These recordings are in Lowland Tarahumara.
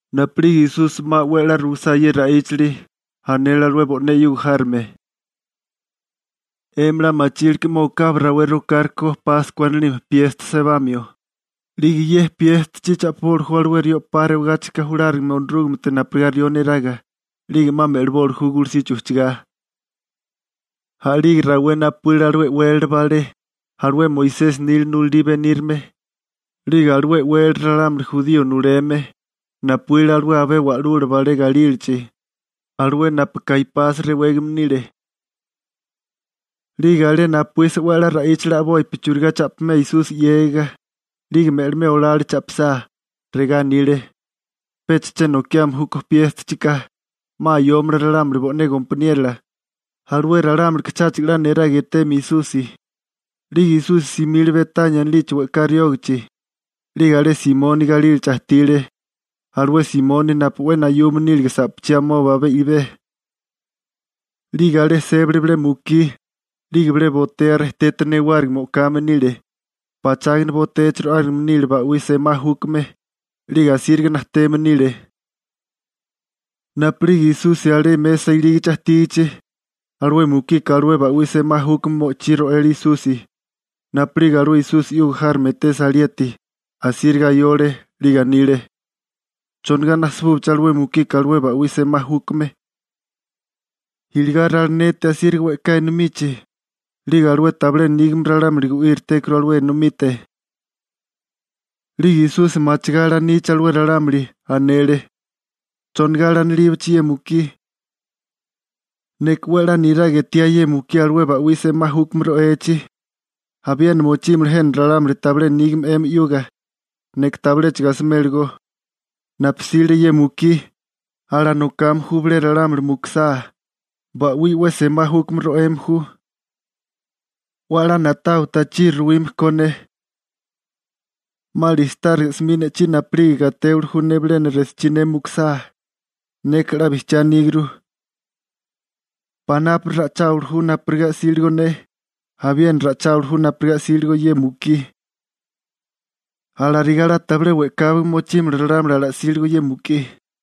Napu'lige Esusi 'ma 'we a'lá ruisá ye ra'íchali, anele alué bo'né 'yuga járome: ―'Emi 'la machilke 'ma okabi rawé rokárikó Páskua anilime piesta sebamio, 'lige ye piéstachi cha'piboli ju alué rió 'pa rewagáchika julárigame Onorúgamete napurigá rió neraga, 'lige 'ma me'liboli ju gulusichi ujchagá. A'lige rawé napuíle alué e'wélala balé, alué Moisesi nila nulalí benírame, 'lige alué e'wélala ralámuli jurío nuleme. Napuíle alué abé wa'lula balé galílachi, alué napu Kaipasi rewégame nile. 'Lige alé napuísa 'we a'lá ra'íchale a'bopi churigá cha'pimea Esusi 'yégiga, 'lige me'limea olale cha'pisá. Regá anile: ―Pecha che nokiame júkó piéstachika, 'ma ayómala ralámuli bo'né gompaniérola, alué ralámulika cháchigo 'la niraga etéeme Esusi. 'Lige Esusi simile Betania anilichi we'ká riógichi, 'lige alé Simoni galílachi ajtile, alué Simoni napu 'we nayume nílige sa'pachí amoba abé i'bé. 'Lige alé sébale bilé mukí, 'lige bilé botea rejtete newárigime o'kame nile. Pachágana botéachi ro'ágame nile ba'wí semá júkame, 'lige asíriga najteme nile. Napu'lige Esusi alé mesa ilígichi ajtígichi, alué mukika alué ba'wí semá júkame mo'chí ro'ele Esusi. Napu'lige alué Esusi 'yuga járome etesa alieti, asíriga ayole 'lige anile: ―¿Chonigá najsabúché alué mukika alué ba'wí semá júkame? Iligá ralineti asíriga we'ká enomichi, 'lige alué tabilé nígame ralámuli gu'íritékuru alué enomite. 'Lige Esusi machigá alanichi alué ralámuli, anele: ―¿Chonigá alanilíbaché ye mukí? Neka 'we a'lá niraga etiá ye mukí alué ba'wí semá júkame ro'echi. Abiena mochímala jena ralámuli tabilé nígame 'emi 'yuga, neka tabiléchigo asimélagó. Napu 'sile ye mukí, alanokame ju bilé ralámuli mukusá, ba'wí 'we semá júkame ro'eme ju. 'We a'lá na'tawa tachiri ruwime ko ne. 'Ma listáriga 'smi ne'chí napu'lige gatéwili ju ne bilena resochí ne mukusá. Neka 'la bijchiá aníguru. Panápuri ra'icháwili ju napurigá 'síligo ne, abiena ra'icháwili ju napurigá 'síligo ye mukí. Alarigá 'la tabilé we'káwaga mochímala ralámuli ala'síligo ye mukí.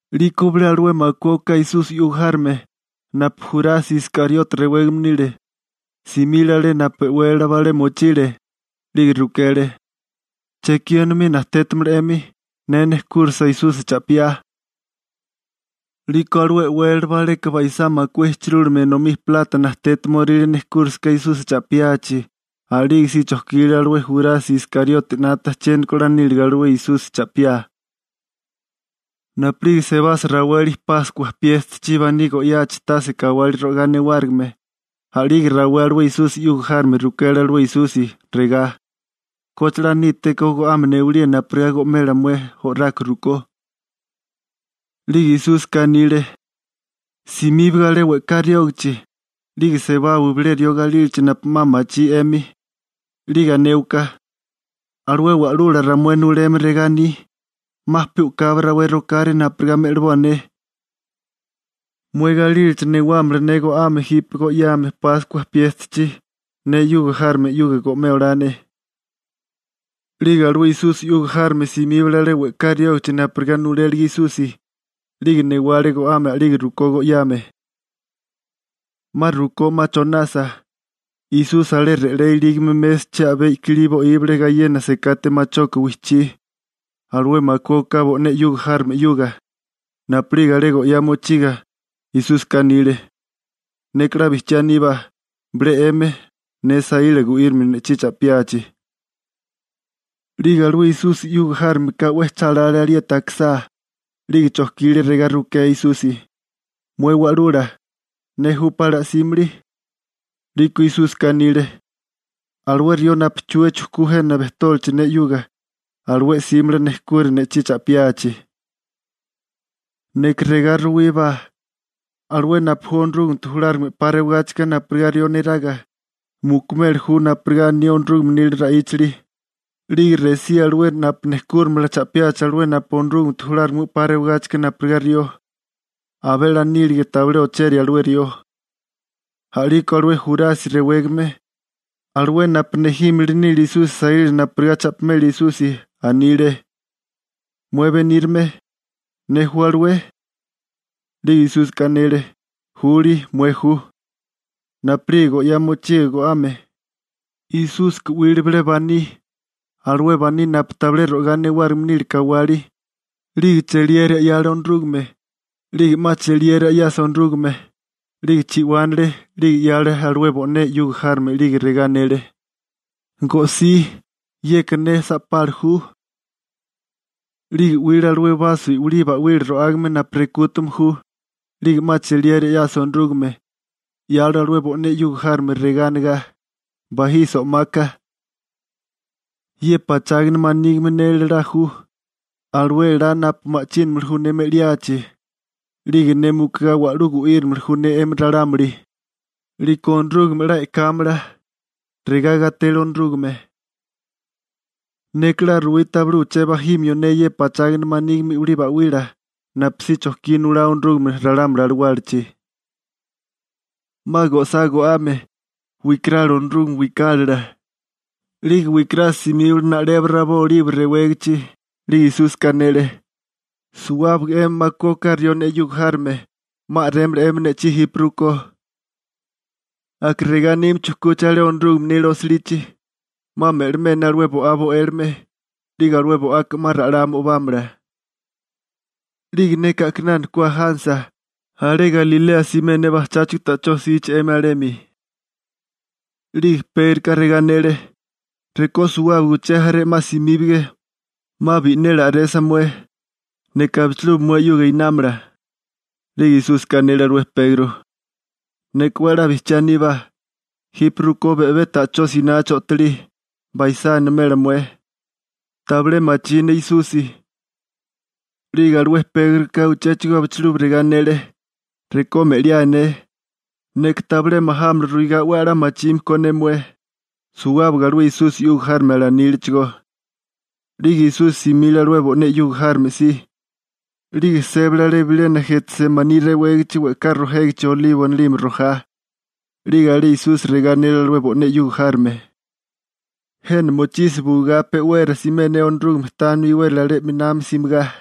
'Liko bilé alué makué oká Esusi 'yuga járome, napu Jurasi Iskariote rewégame nile, simile alé napu e'wélala balé mochile, 'lige rukele: ―¿Chekí enomí najtétamala 'emi, ne nejkúrisa Esusi cha'piá? 'Liko alué e'wélala baleka baisá makué ijchirúlime enomí plata najtétamoríle nejkúrisaká Esusi cha'piachi. A'lige si chojkile alué Jurasi Iskariote 'nata chiéniko 'la níliga alué Esusi cha'piá. Napu'lige sebasa raweli Páskua piéstachi baní go'yachi tase kawali ro'igá newárigime, a'lige rawé alué Esusi 'yuga járome rukele alué Esusi, regá: ―¿Koche 'la nítéko go'ame newalía napurigá go'mela mué o'rako rukó? 'Lige Esúsika anile: ―Simíbaga alé we'ká riógichi, 'lige sebawa bilé rió galílachi napu 'ma machí 'emi, 'lige anéwaká: «Alué Wa'lula ramué nuleme regá aní: 'Ma pe u'kabi rawé rokáré napurigá me'liboa ne. Mué galílachi newámala ne go'ame jipe go'yame Páskua piéstachi, ne 'yuga járome 'yuga go'mé olá ne.» 'Lige alué Esusi 'yuga járome simíbale alé we'ká riógichi napurigá nulélige Esusi, 'lige newale go'ame a'lige rukó go'yame. 'Ma rukó 'ma chonasa, Esusi alé re'lé ilígame mésachi a'bé kilí bo'íbale gayena sekate machoka wijchí, alué makué oká bo'né 'yuga járome 'yuga. Napu'lige alé go'yá mochiga, Esúsika anile: ―Neka 'la bijchiá aníbá, bilé 'emi, ne saíla gu'írimio ne'chí cha'piachi. 'Lige alué Esusi 'yuga járome ka 'we cha lale alieti akisá,'lige chojkile regá rukea Esusi: ―Mué Wa'lula, ¿ne júpá ala'símili? 'Liko Esúsika anile: ―Alué rió napu chua chujkú jena bejtólichi ne 'yuga, alué 'símala nejkura ne'chí cha'piachi. Neka regá ruwíbá, alué napu ju Onorúgamete julárigame 'pa rewagáchika napurigá rió neraga, mukumeli ju napurigá aní Onorúgame nila ra'íchali, 'lige resía alué napu nejkúrimala cha'piachi alué napu ju Onorúgamete julárigame 'pa rewagáchika napurigá rió. Abé a'lá nílige tabilé ocheria alué rió. A'liko alué Jurasi rewégame, alué napu nejímili nile Esusi saíla napurigá cha'pimela Esusi, anile: ―Mué benírame, ¿ne ju alué? 'Lige Esúsika anele: ―Juli, mué ju. Napu'lige go'yá mochiga go'ame, Esúsika 'wile bilé baní, alué baní napu tabilé ro'igá newárigime nile kawali, 'lige cheliera 'yale Onorúgame, 'lige 'ma cheliera 'yasa Onorúgame, 'lige chi'wánale, 'lige 'yale alué bo'né 'yuga járome 'lige regá anele: ―Go'sí, yeka ne sa'pala ju. 'Lige 'wile alué baso i'wilí ba'wila ro'ágame napu rekútame ju, 'lige 'ma cheliera 'yasa Onorúgame, 'yale alué bo'né 'yuga járome regá anigá: ―Bajisi o'maka. Ye pachágana manígime ne elalá ju, alué elá napu ma'chínimili ju ne me'liachi, 'lige ne mukugá wa'lú gu'írimili ju ne 'emi ralámuli, 'liko Onorúgame 'la e'kámala. Regá gatele Onorúgame. Neka 'la ruwí tabilé uché bajimio ne ye pachágana manígime i'wilí ba'wila napusí chojkí nulá Onorúgame ralámuli alawálachi. 'Ma go'sá go'ame, wikarale Onorúgame wikálala, 'lige wikarasa simíbale na'lebo rabó Olibo rewégichi. 'Lige Esúsika anele: ―Suwábaga 'emi makué oká rió ne 'yuga járome, 'ma a'rémala 'emi ne'chí jipe rukó. Aka regá anime chujkúché alé Onorúgame nila osilichi: «'Ma me'limé ne alué bo'á bo'élome, 'lige alué bo'aka 'ma ra'lá mo'bámala.» 'Lige neka a'kinana ku ajánasa, alé Galilea simé ne bajcháchigo ta'chó jsichi 'emi alemi. 'Lige Pégroka regá anele: ―Rekó suwábaga uché jaré 'ma simíbige, 'ma bi'neli a'resa mué, neka abichilubi mué 'yuga einámala. 'Lige Esúsika anele alué Pegro: ―Neka 'we a'lá bijchiá aníbá, jipe rukó be'bé ta'chó sinachi o'tolí, baisá animela mué: «Tabilé machí ne Esusi.» 'Lige alué Pégroka uchéchigo abichilubi regá anele: ―Rekó me'liáe ne, neka tabilé majámala ruigá 'we a'lá machime ko ne mué. Suwábaga alué Esusi 'yuga járome alanílechigó. 'Lige Esusi simile alué bo'né 'yuga járome si, 'lige sébale alé bilena Jetsemaní rewégichi we'ká rojégichi olibo anilime rojá. 'Lige alé alué Esusi regá anele alué bo'né 'yuga járome: ―Jena mochisi buigá, pe'wera simé ne Onorúgame tánimia iwérali alé 'minami simigá.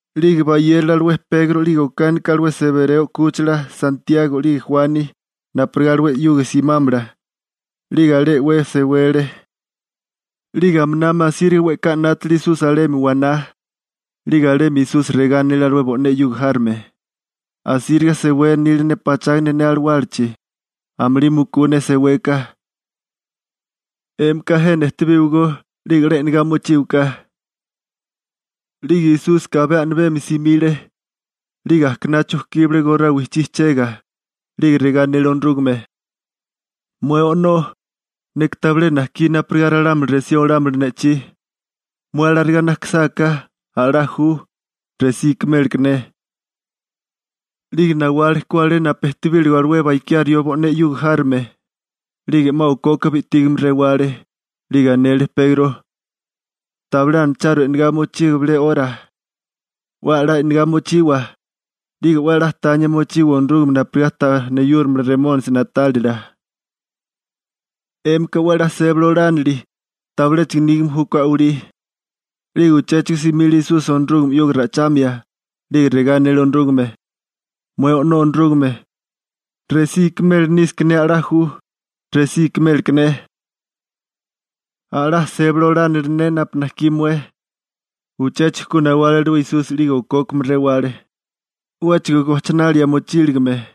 'Lige bayérole alué Pegro 'lige okánika alué Sebereo 'kúchila (Santiago 'lige Juani) napurigá alué 'yuga simámala, 'lige alé 'we sewele, 'lige aminami asíriga we'ká 'nátale Esusi alemi waná. 'Lige alemi Esusi regá anele alué bo'né 'yuga járome: ―Asíriga sewé nili ne pachágana ne alawálachi, amulí mukú ne seweka. 'Émika jena ejtebíwagó 'lige 'la e'negá mochíwaká. 'Lige Esúsika abé a'mibemi simile, 'lige ajkaná chujkíbale gorá wijchí chega, 'lige regá anele Onorúgame: ―Mué O'nó, neka tabilé najkí napurigá ralámuli resí olámala ne'chí. Mué alarigá najkisáká, a'lá ju, resí ikiméleké ne. 'Lige nawale ku alé napu ejtebílige alué bakiá rió bo'né 'yuga járome, 'lige 'ma okoka bi'tígame rewale, 'lige anele Pegro: ―¿Tabilé anacharu e'negá mochiga bilé 'ora? 'We a'lá e'negá mochiwa, 'lige 'we a'lá tania mochiwa Onorúgame napurigá ta neyúrimala Remónisi na'tálila. 'Émika 'we a'lá sébali olánili, tabiléchigo nígame júkó a'walí. 'Lige uchéchigo simile Esusi Onorúgame 'yuga ra'ichamia, 'lige regá anele Onorúgame: ―Mué O'nó Onorúgame, resí ikimeli nísaká ne a'lá ju, resí ikiméleké ne. A'lá sébali olánili ne napu najkí mué. Uchéchigo ku nawale alué Esusi 'lige okókame rewale, 'wéchigo gojchinalia mochíligime.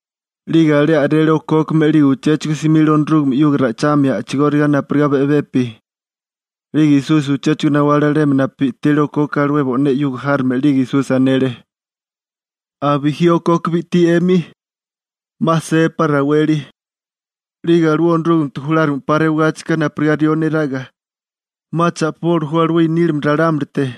'Lige alé a'rele okókame 'lige uchéchigo simile Onorúgame 'yuga ra'ichamia a'chigóriga napurigá be'bepi. 'Lige Esusi uchéchigo nawale alemi napu bi'tile okoka alué bo'né 'yuga járome 'lige Esusi anele: ―¿'A bijí okoka bi'tí 'emi? 'Ma sébapá raweli, 'lige alué Onorúgamete julárigame 'pa rewagáchika napurigá rió neraga, 'ma cha'piboli ju alué i'nílime ralámulite.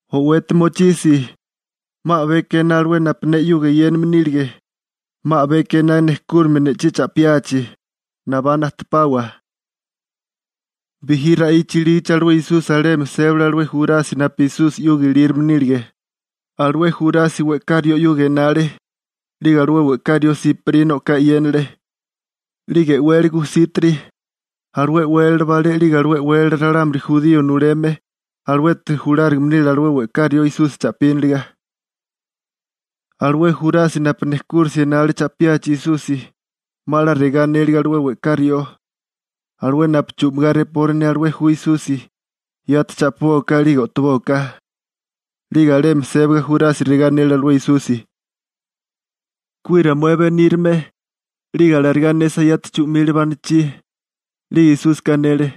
O'weti mochisi, 'ma a'beka ená alué napu ne 'yuga eyéname nílige, 'ma a'beka ená nejkúrimia ne'chí cha'piachi. Nabá najtepawa. Bijí ra'icha ilígachi alué Esusi alemi sébale alué Jurasi napu Esusi 'yuga ilírome nílige. Alué Jurasi we'ká rió 'yuga enale, 'lige alué we'ká rió siparina o'ká e'yénale, 'lige e'wele gujsítiri. Alué e'wélala balé 'lige alué e'wélala ralámuli jurío nuleme, aluete julárigame nile alué we'ká rió Esusi cha'píniliga. Alué Jurasi napu nejkúrisia enale cha'piachi Esusi, 'ma 'la regá anélige alué we'ká rió: ―Alué napu chu'migá repori ne alué ju Esusi, yati cha'pibóaká 'lige o'tobóaká. 'Lige alemi sébaga Jurasi regá anele alué Esusi: ―¡Kuira mué benírame! 'Lige alarigá anesa yati chu'mile banichí. 'Lige Esúsika anele: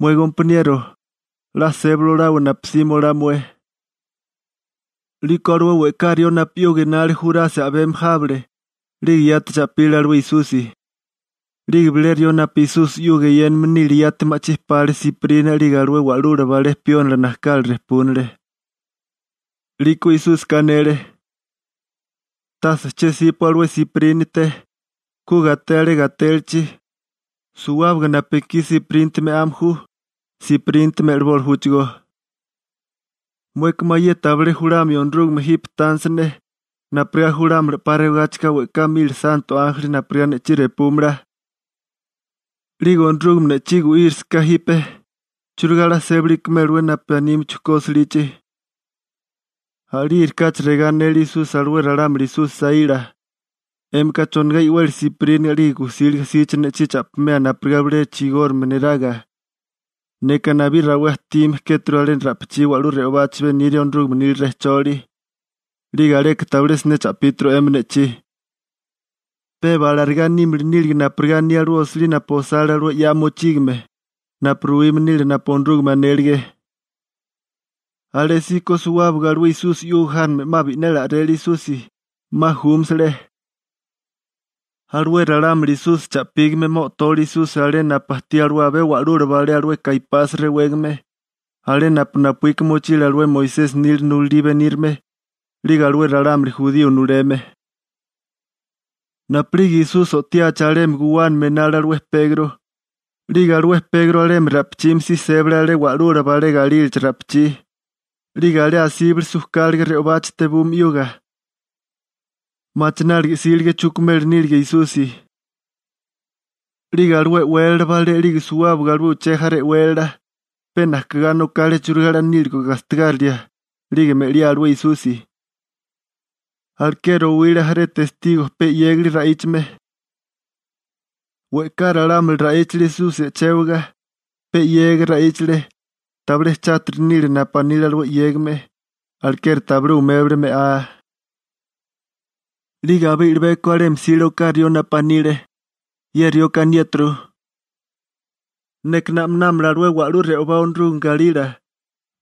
―Mué gompaniero, 'la sébali olawa napu 'sima olá mué. 'Liko alué we'ká rió napu 'yuga enale Jurasi a'bemi jábale, 'lige yati cha'pile alué Esusi. 'Lige bilé rió napu Esusi 'yuga eyéname nile yati ma'chí pale siparina 'lige alué wa'lula balé piónila najkala rejpúnale. 'Liko Esúsika anele: ―Tase che 'sípua alué siparínate, ku gaté alé gatélachi. Suwábaga napu ekí siparínate me'ame ju, siparínate me'liboli júchigó. ¿Mueka mayé tabilé julamio Onorúgame jipe tánisa ne, napurigá julámala 'pa rewagáchika we'ká mili santo ánjeli napurigá ne'chí repúmala? 'Lige Onorúgame ne'chí gu'írasaká jipe, ¿churigá 'la sébali ikimélewé napu anime chujkú osilichi? A'lígerikáchi regá anele Esusi alué ralámuli Esusi saíla: ―¿'Émika chonigá i'weli siparíniga 'lige gujsíliga síché ne'chí cha'pimea napurigá bilé chigórigame neraga? Neka nabí rawé ajtime kéturu alé ra'pichí wa'lú re'obachi beniria Onorúgame nila rejcholi, 'lige aleka tabilé siné cha'píturu 'emi ne'chí. Peba alarigá nímili nílige napurigá aní alué osilí napu osale alué 'ya mochígame napu ruwime nile napu Onorúgame anélige. Alésíko suwábaga alué Esusi 'yuga járome 'ma bi'neli a'rele Esusi, 'ma júmasale. Alué ralámuli Esusi cha'pígame 'ma o'tole Esusi alé napu ajtí alué abé wa'lula balé alué Kaipasi rewégame, alé napu napuíka mochile alué Moisesi nila nulalí benírame, 'lige alué ralámuli jurío nuleme. Napu'lige Esusi o'tiachi alemi guwánami enale alué Pegro, 'lige alué Pegro alemi ra'pichimi si sébale alé wa'lula balé galílachi ra'pichí, 'lige alé asíbale sujkáliga re'obachi tebume 'yuga. Machináliga 'sílige chukumeli nílige Esusi. 'Lige alué e'wélala balé 'lige suwábaga alué uché jaré e'wélala, pe najkigá nokale churigá 'la níligo gastigárilia, 'lige me'liá alué Esusi. Alekeri owile jaré testigo pe 'yégali ra'íchame. We'ká ralámuli ra'íchale Esusi e'chéwaga, pe 'yega ra'íchale, tabilé chátiri nile napu anile alué 'yégame, alekeri tabilé umébale me'á. 'Lige abé i'libeko alemi jsile oká rió napu anile: ―Ye rioka aniéturu: «Neka na'minámala alué wa'lú re'obá Onorúgame galila,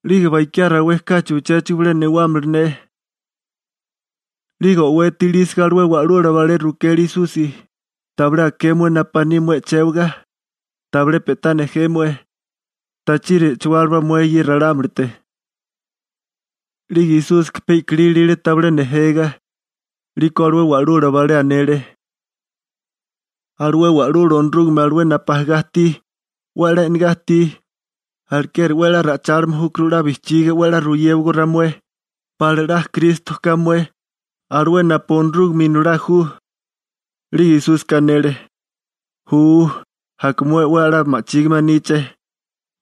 'lige bakiá rawé kachi uchéchigo bilé newámala ne.» 'Lige o'weti ilísaga alué wa'lula balé rukele Esusi: ―¿Tabilé aké mué napu aní mué e'chéwaga? ¿Tabilé pe'tá nejé mué? ¿Chongá lanilí mué alué ralámulite? 'Lige Esúsika pe i'kilí ilile tabilé nejega. 'Liko alué wa'lula balé anele: ―Alué Wa'lula Onorúgame alué napu ajagá ajtí, 'we a'lá e'negá ajtí, alekeri 'we a'lá ra'ichálime júkuru 'la bijchiga 'we a'lá ruyéwagó ramué, ¿pala 'la Kristo ka mué, alué napu Onorúgame Inolá ju? 'Lige Esúsika anele: ―Ju, aka mué 'we a'lá ma'chígime aníché,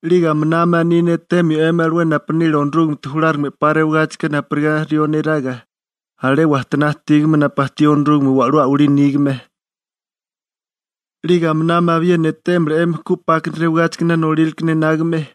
'lige aminami aní ne etemio 'emi alué napu nile Onorúgamete julárigame 'pa rewagáchika napurigá rió neraga, alé wajtoná ajtígame napu ajtí Onorúgame wa'lú a'walí nígame. 'Lige aminami abiena etémala 'emi ku 'pákana rewigáchikana nolíraleka enágame.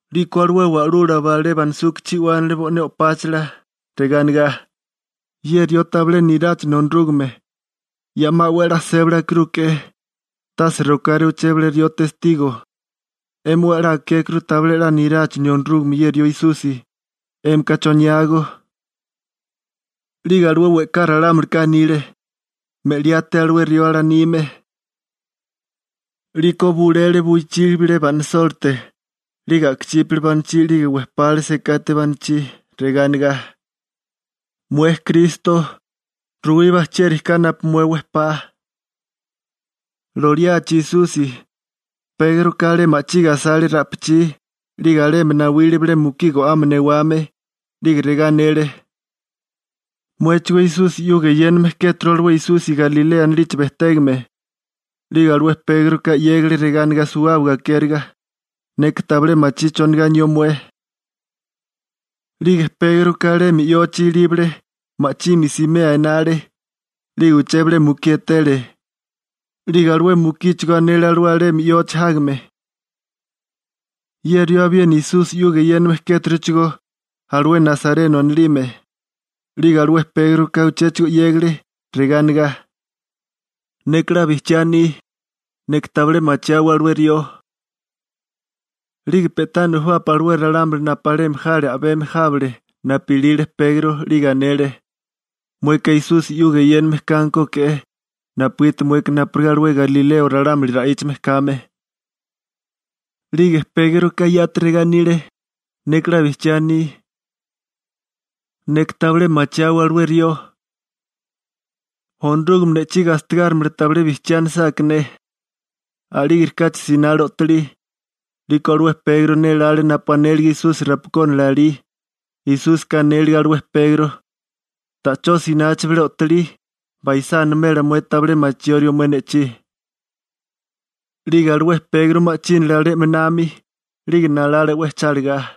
'Liko alué wa'lula balé banasuka chi'wánale bo'né o'páchala, regá anigá: ―¡Ye rió tabilé niráchine Onorúgame! Ya 'ma 'we a'lá sébali akirúke'é, tase rokáré uché bilé rió testigo. 'Émi 'we a'lá akékuru tabilé 'la niráchinio Onorúgame ye rió Esusi. 'Émika ¿choniágó? 'Lige alué we'ká ralámulika anile: ―Me'liáté alué rió alanime. 'Liko bulele buichí bilé ba'nisólite, 'lige a'kachípale banachí 'lige wejpale sekate banachí regá anegá: ―Mué Kristo, ruwíbá, ¿chieri ka napu mué wejpá? Loliachi Esusi, Pégroka alé ma'chige asale ra'pichí, 'lige alemi nawile bilé mukí go'ame newame, 'lige regá anele: ―Muéchigó Esusi 'yuga eyéname kéturu alué Esusi Galilea anilichi bejtégame. 'Lige alué Pégroka 'yégale regá anigá suwábaga akériga: ―Neka tabilé machí chonigá anió mué. 'Lige Pégroka alemi yochi ilíbale, ma'chimi simea enale, 'lige uché bilé mukí etele, 'lige alué mukíchigó anele alué alemi yochi jágame: ―Ye rió abiena Esusi 'yuga eyéname kéturuchigó, alué Nasareno anilime. 'Lige alué Pégroka uchéchigo 'yégale, regá anigá: ―Neka 'la bijchiá aní. Neka tabilé machiáwé alué rió. 'Lige pe'tá nujubapi alué ralámuli napu alemi jale a'bemi jábale napu ilile Pegro, 'lige anele: ―Mueka Esusi 'yuga eyéname kánkoke'é, napugiti mueka napurigá alué galileo ralámuli ra'íchame kame. 'Lige Pégroka yati regá anile: ―Neka 'la bijchiá aní. Neka tabilé machiáwé alué rió. Onorúgame ne'chí gastigárimala tabilé bijchiá anisáká ne. A'lígerikáchi sinale o'tolí. 'Liko alué Pegro nélále napu anílige Esusi rapakónala alí. Esúsika anélige alué Pegro: «Ta'chó sinachi bilé o'tolí, baisá animela mué tabilé machiórió mué ne'chí.» 'Lige alué Pegro ma'chínale alé 'minami, 'lige nalale 'we chálagá.